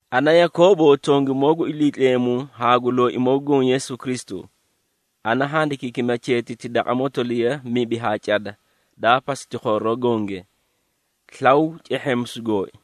Ana Yakoobo, tongimoo gu Iliitleemu haa gu Looimoo gu Goõ, Yeesu Kristu. Ana handikiikima cheetiti daqa motoliya mibi haa cada daa pasiti khooroo gonge. Slaw cehheemisu gooi!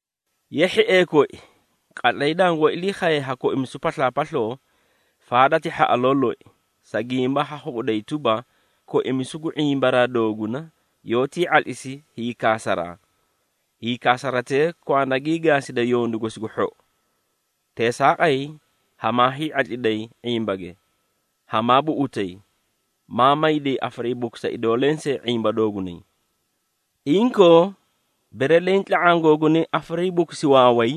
Ye hhiee koi, qatlay dangoó ilii khaye ha koimisu paslaapasloo, faada ti hhaꞌaloo loi, sa gimba ha khuꞌuday tuba, koimisu gu ⁄imba dooguna yoótii ⁄atlisi hiikaasaraa. Hiikaasaratee kwanda gii gaaside yondu gosi gu hhou. Teesaaqay hamaa hii⁄atliday ⁄imbage, hamaa buꞌutay, maa mayday afariibukusa idoo lensee ⁄imba doogunay. Inkoo, bere leẽ tla⁄aã googunay afariibukusi waaway,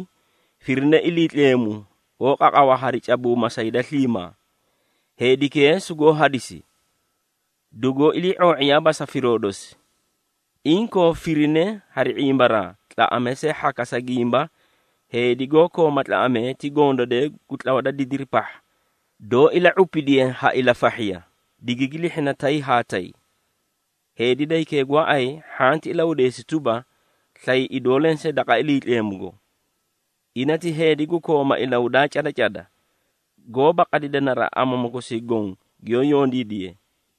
firine Iliitleemu, goó qaqawa hari cabuuma sa hida sliimaa. Heedikee sugoó hadisi, dugoo ilii⁄oo⁄iyaaba sa firoo dosi. Inkoo, firine hari ⁄imbaraa, tlaꞌamee see hhaka, sa gimba heedi goó kooma tlaꞌamee ti gondadee gu tlawa da didiri pahha, doó ila⁄upidiye ha ilafahhiya, digigi lihhina tay haa tay. Heedi da hikee gooay hhanti ilahudeesi tuba, slay idoo lensee daqa Iliitleemugo. Ina ti heedi gu kooma ilahudaa cada cada, goóba qadida naraꞌa amamu kosii goõ giyoó yondiidiye.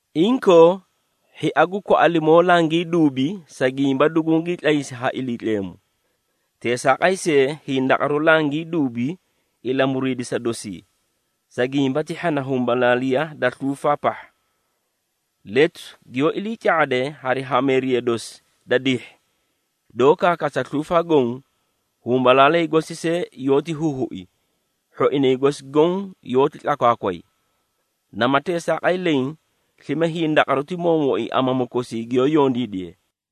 Inkoo, hhia gu kwaꞌalimoo langii duubi, sa gimba dugungii tlaysi ha Iliitleemu. Teesaaqay see, hindaqaru langii duubi ilamuriidisa dosii, sa gimba ti hhana humbalaaliya da sluufaa pahha. Letu giyoó ilii ca⁄ade hari hameeriya dosi da dihhi, doó kaakaasa sluufaa goõ, humbalaalay gosi see yoóti huhui, hhoinay gosi goõ yoóti tlakwaakway. Nama teesaaqay leẽ, slime hindaqaru ti moomooi amamu kosii giyoó yondiidiye.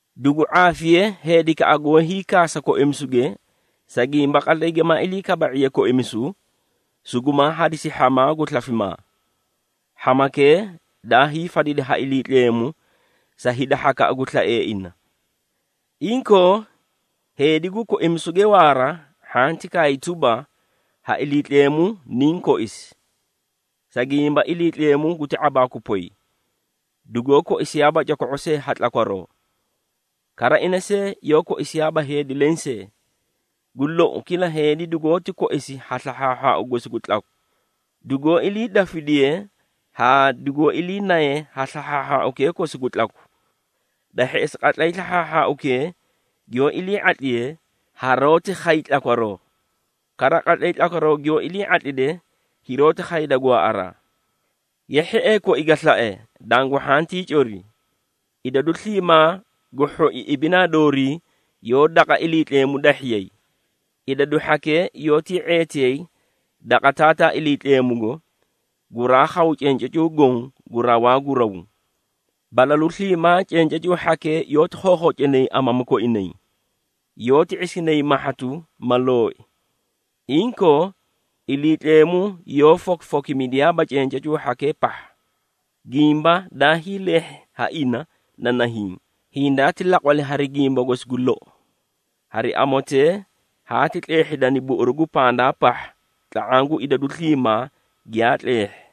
Dugu ⁄aafiye heedikaꞌa goó hiikaasa koimisuge, sa gimba qatlay gimaa ilii kaba⁄iye koimisu, sugumaa hadisi hhamaa gu slafimaa. Hhamakee daa hiifadidi ha Iliitleemu sa hida hhakaꞌa gu slaee ina. Inkoo, heedi gu koimisuge waara, hhanti kaay tuba, “Ha Iliitleemu niniĩ koisi!” Sa gimba Iliitleemu guti ⁄abaaku poy, dugoó koisiyaaba coko⁄o see ha tlakwaroo. Kara ina see yoó koisiyaaba heedi lensee. Gu lou, kila heedi dugoóti koisi ha slahhaahhaau gosi gu tlaku, dugoó iliidafidiye haa dugoó iliinaye ha slahhaahhaaukee kosi gu tlaku. Da hheꞌesi, qatlay slahhaahhaaukee giyoó ilii ⁄atliye, haroóti khay tlakwaroo. Kara, qatlay tlakwaroo giyoó ilii ⁄atlide, hiroóti khayda gwaaꞌaraa. Ye hhiee koi ga slae, dangu hhantii cori. Idadu sliimaa gu hhoi ibinaa doorii yoó daqa Iliitleemu dahhiyay. Idadu hhakee yoótii ⁄eetiyay daqa Taataa Iliitleemugo, guraa khaw cencacuu goõ gu rawaa gu raw. Balalu sliimaa cencacuu hhakee yoóti khookhocinay amamu koinay, yoóti ⁄isinay mahhatu ma looyi. Inkoo, Iliitleemu yoó fokifokimidiyaaba cencacuu hhakee pahha. Gimba daa hiileehhi ha ina na nahiĩ: hindaati laqwali hari gimba gosi gu lou. Hari amotee haati tleehhidani buꞌuru gu pandaa pahha tla⁄aã gu idadu sliimaa giyaa tleehhi.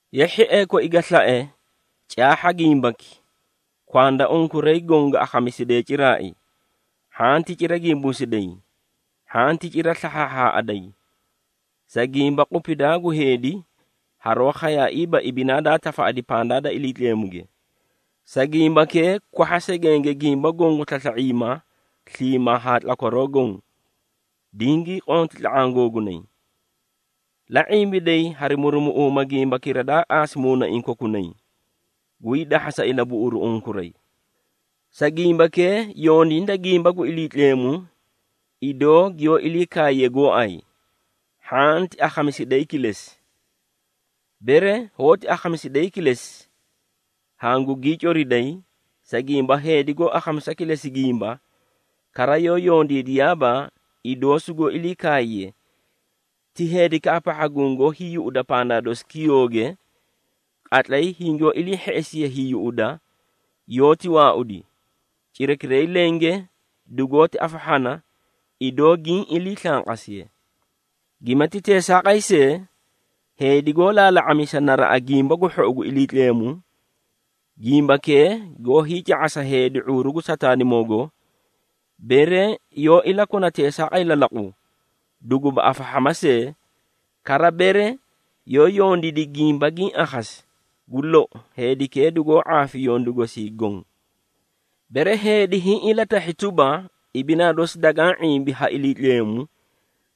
Ye hhiee koi ga slae, caahha gimbaki: kwanda unkuray goõ ga akhamisidee ciraai, hhanti cira gimbuusiday, hhanti cira slahhaaꞌaday! Sa gimba qupidaa gu heedi haroó khayaiiba ibinaa daa tafaꞌadi pandaa da Iliitleemuge. Sa gimbakee, kwahha segenge gimba goõ gu slasla⁄iima sliimaa haa tlakwaroo goõ, dingii qonti tla⁄aã googunay. La ⁄imbiday hari murumuꞌuuma gimbakira daa qaasi muunaiĩ kokunay, guyii dahhasa ilabuꞌuruu unkuray. Sa gimbakee yondiida gimba gu Iliitleemu, idoo giyoó ilii kaaye gooay, hhanti akhamisidayi kilesi. Bere hoóti akhamisidayi kilesi, hangugii coriday, sa gimba heedi goó akhamisa kilesi gimba, kara yoó yondiidiyaaba idoo sugoó ilii kaaye, ti heedikaꞌa pahha gungoó hiiyuꞌuda pandaa dosi kiyooge. Qatlay hingoó ilii hheꞌesiye hiiyuꞌuda, yoóti waaudi, cirakiray lenge dugoóti afahhana, idoo giĩ ilii slanqasiye. Gimati teesaaqay see, heedi goó laala⁄amisa naraꞌa gimba gu hhou gu Iliitleemu, gimbakee goó hiica⁄asa hida ⁄uuru gu Sataanimoogo, bere yoó ilakona teesaaqay lalaqu, duguba afahhama see, kara bere yoó yondiidi gimba giĩ akhasi, gu lou, heedikee dugoó ⁄aafi yondu gosii goõ. Bere heedi hiĩ ilatahhi tuba, ibinaa dosi dagaã ⁄imbi ha Iliitleemu,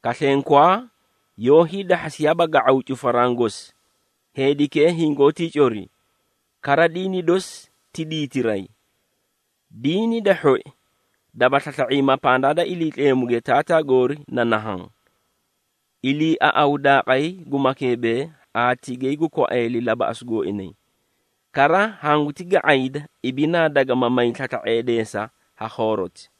kaslenkwaa, yoó hiidahhasiyaaba ga⁄aw cufaraã gosi, heedikee hingoótii cori, kara diini dosi ti diitiray. Diini da hhoi, daba slasla⁄iima pandaa da Iliitleemuge Taataa goorii na nahaã, iliiaꞌawu daaqay gu makeebee haa tigay gu kwaeeli labaꞌasu gooinay. Kara hanguti ga⁄ayda, ibinaa dagama may slasla⁄eedeesa ha khooroti.